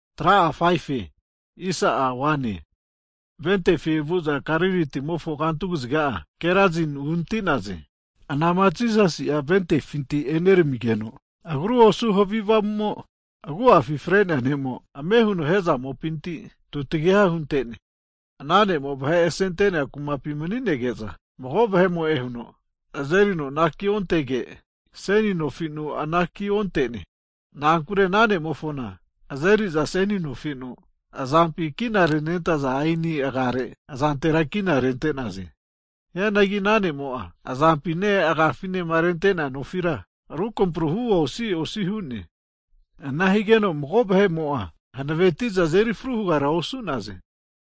Hagi Ventefi vu'za Galili timofo kantu kaziga'a Gerasin uhanati'naze. Anama Jisasi'a votifinti eneramigeno'a, agru osu havi avamumo agu'afi fre'nea ne'mo'a, ame huno hezamopinti (matipinti) eme tutagiha hunte'ne. Ana ne'mo vahe asenentea kumapi mani'nege'za, mago vahemo'e huno azerino anaki ontege, seni nofinu anaki onte'ne. Na'ankure ana ne'mofona azeriza seni nofi'nu azampi kina renentaza aeni agare azantera kina rente'naze. Hianagi ana ne'mo'a azampine agafinema rente'nea nofira rukampruhu osi osi hu'ne. Ana higeno mago vahe'mo'a hanaveti'za azeri arava hugara osu'naze.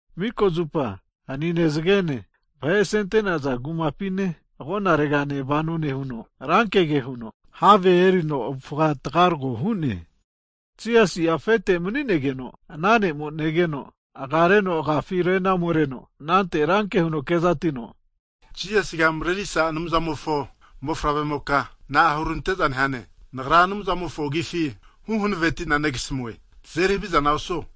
Mika zupa hanine, zagene vahe asenentaza kumapine agonaregane vano nehuno, rankege huno, have erino avufa tagarago hu'ne. Jisasi'a afete mani'negeno ana ne'mo negeno, agareno agafi ome renareno, anante ranke huno kezatino, Jisasiga marerisa Anumzamofo Mofavremoka, na'a hurante'za nehane! Nagra Anumzamofo agifi huhanavetina negasamue, tazeri havizana osuo!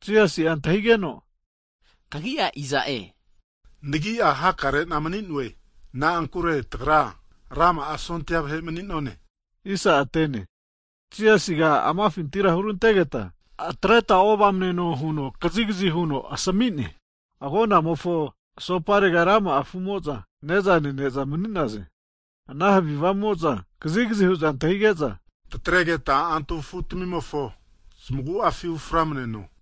Jisasi'a Kagi'a iza'e huno antahigegeno? Nagini'a hakarena mani'noe, Na'ankure tagra rama'a sondia vahe mani'none. Jisasiga amafintira hurantegeta atreta ovamneno huno kazikazi huno asami'ne. Hagi agonamofo asoparega rama'a afu'mo'za ne'za nene'za mani'naze. Ana havi avamumo'za kazigazi hu'za antahige'za, tataregeta antu afutamimofo zamagu'afi uframaneno hu'za hu'naze.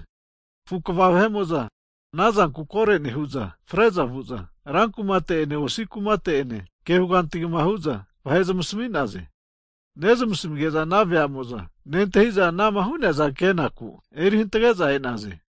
Anante afu kva vahe'mo'za koro nehu'za, fre'za vu'za rankumate'ene osi kumate'ene ke huganti hugma hu'za vahera zamasmi'naze. Nezmasmige'za ana veamo'za nentahi'za ana'ma hu'neaza kenaku eri hantage'za e'naze.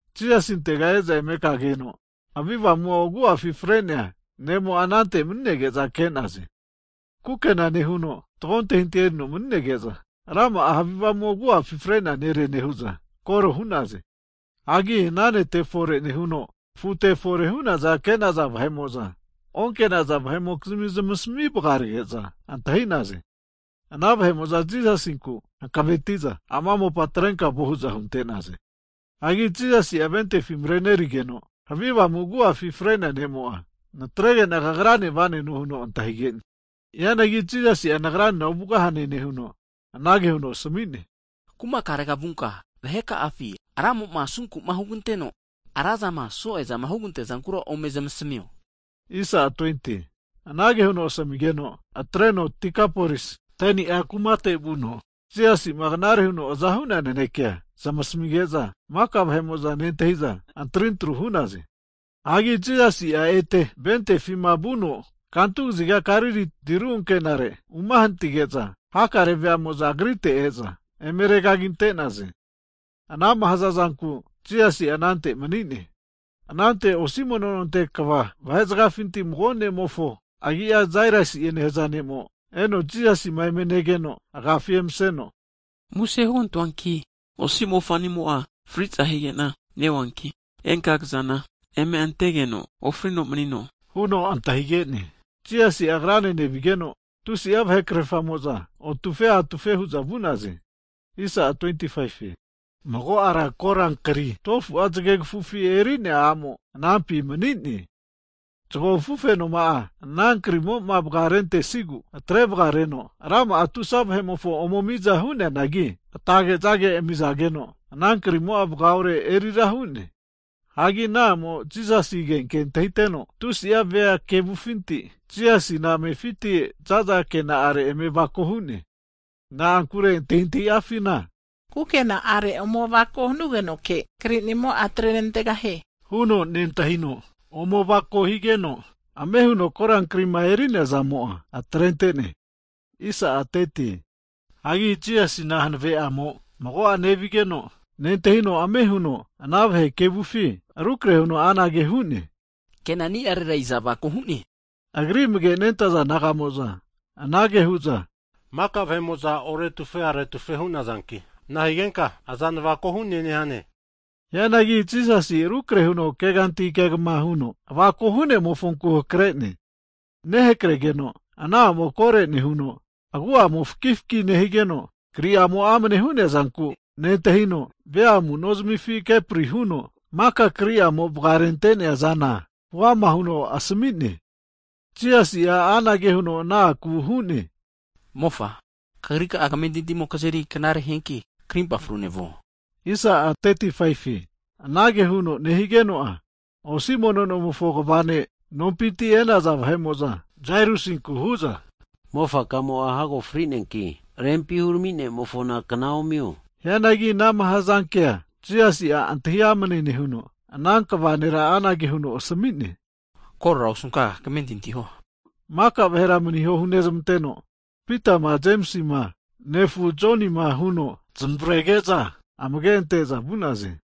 Jisasinte e'za eme kageno havi avamu'mo'ma agu'afi fre'nea ne'mo'a anante mani'nege'za ke'naze. Kukena nehuno fatgo antahintahi erino mani'nege'za, rama'a havi avamumo agu'afi fre'nea nere nehu'za koro hu'naze. Hagi ana nete'ma fore'msa nehuno afute'enema fore hu'neazama ke'naza vahe'mo'za onke'naza vahe'mokizmi zamasmi vagarage'za antahi'naze. Hagi ana vahe'mo'za Jisasinku hankavetiza, ama mopa atreno vanie hu'za hunte'naze. Hagi Jisasi'a votifi marenerigeno havi avamu'mo'ma agu'afi fre'nea ne'mo'a, natregena kagrane va'neno huno antahige'ne. Hianagi Jisasi'a nagranena ovugahane nehuno, anage huno asami'ne, Kumakarega vunka, vahe ka'afi Ramo'ma asunku'ma huganteno, razama so'eza hugante'nea zankura ome zamasamio. Anage huno asamigeno atreno Dekapolisi 10ni'e nehaza kumate vuno Jisasi'ma knare huno aza hu'nea nanekea zamasmige'za, maka vahe'mo'za nentahi'za antarintru hu'naze. Hagi Jisasi'a ete votifima vuno kantu kaziga Galili tiru ankenare'ma umahanatige'za, hakare veamo'za agrite e'za eme regagi ante'naze. Anama hazazanku Jisasi'a anante mani'ne. Anante osi mono nonte kva vahe zagafinti mago ne'mofo agi'a Jairusi'e nehaza ne'mo'a, eno Jisasima eme negeno'a, agafi emaseno, muse hugantoanki, osi mofa'nimo'a fri'za higena neonki, enka kazana agofetu eme antegeno ofrino manino huno antahige'ne. Higeno Jisasi'a ana ne'ene nevigeno tusi'a vahe krerfamo'za otufe atufe hu'za vu'naze. Hagi mago ara korankria 12fu'a zage kafufi eri'nea a'mo anampi mani'ne. Zago afufenoma'a ana krimoma vagarentesigu atrevagareno rama'a tusa vahe'mofo ome miza hu'neanagi, atage'za amizageno ana kri'amo'a vagaore rura hu'ne. Hagi ana a'mo'a Jisasi agenke antahiteno tusi vea kevufinti, Jisasina amefiti zaza kena'are eme avako hu'ne. Na'ankure antahintahi afina kukena'are ome avako hanugenoke kri'nimo'a atrenantegahie huno nentahino, ome avako higeno ame huno korankrima eri'neazamo'a atrentegeno keno antahino hu'ne. Hagi Jisasina mago'a hanave'amo agripinti nevigeno nentahino, ame huno ana vahe kevufinti rukrahe huno anage hu'ne, Kenani'arera iza avako hu'ne? Higeno Agri amage'ma nentaza disaipol naga'mo'za anage hu'za, mika vahe'mo'za oretufe aretufe hu'nazanki nahigenka, aza navako hu'ne nehane? Hianagi Jisasi'a rukrehe huno keganti kegma huno avako hu'nemofonku hakare'ne. Nehakregeno ana a'mo'a koro nehuno agu'amo'a fakifaki nehigeno kri'ama amane hu'nea zanku nentahino, avuga kepri huno maka kri'amo vagarenteazana huama huno asami'ne. Jisasi'a anage huno ana akura hu'ne, Mofa, kagri ka'a kamentintimo kazeri knare hianki, karimpa frune vugeno krikamo'a atreganteno. Anage huno nehigeno'a, osi mono nomofo kva ne' nompinti e'naza vahe'mo'za, Jairusinku hu'za mofa kamo'a hago fri'neanki rempi hurami ne'mofona kna omio. Hianagi anama hazankea Jisasi'a antahi amane nehuno, ana kva nera anage huno asami'ne, Korora osunka kamentinti huo. Nehuno maka vahera maniho hunezmanteno, Pitama Jemisi nefu Joni'ma Jemisima huno zamavarege'za amage ante'za vu'naze.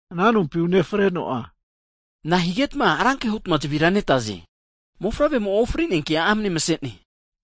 Ana nompima unefreno'a, Na'a higetma ranke hutma zavira netaze, mofavremo'a ofrineanki amane mase'ne.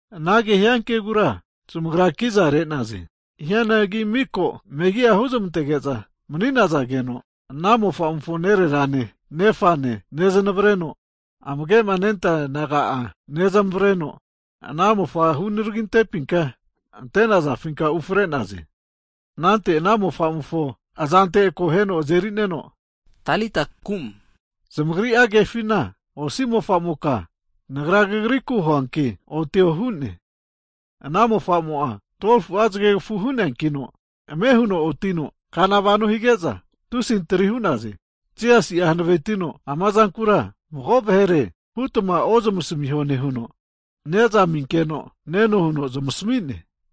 Anagema hiankegura zamagra kiza re'naze. Hianagi miko megi'a huzmantege'za mani'zageno, ana mofa'mofo nererane, nefane nezanevareno amage'ma nentaza disaipol naga'a nezamavareno ana mofa'ma hunaragi antepinka ante'nazafinka ufre'naze. Anante ana mofamofo azante akoheno aze'nerino Talita kum! Zamagri'a kefina osi mofa'moka Nagra kagriku huanki otio hu'ne. Ana mofamo'a 12fu'a zagegafu hu'neakino ame huno otino kana vano hige'za tusi antri hu'naze. Jisasi'a hanavetino ama zankura mago vahere hutma ozmasamiho nehuno, ne'za aminkeno neno huno zamasami'ne.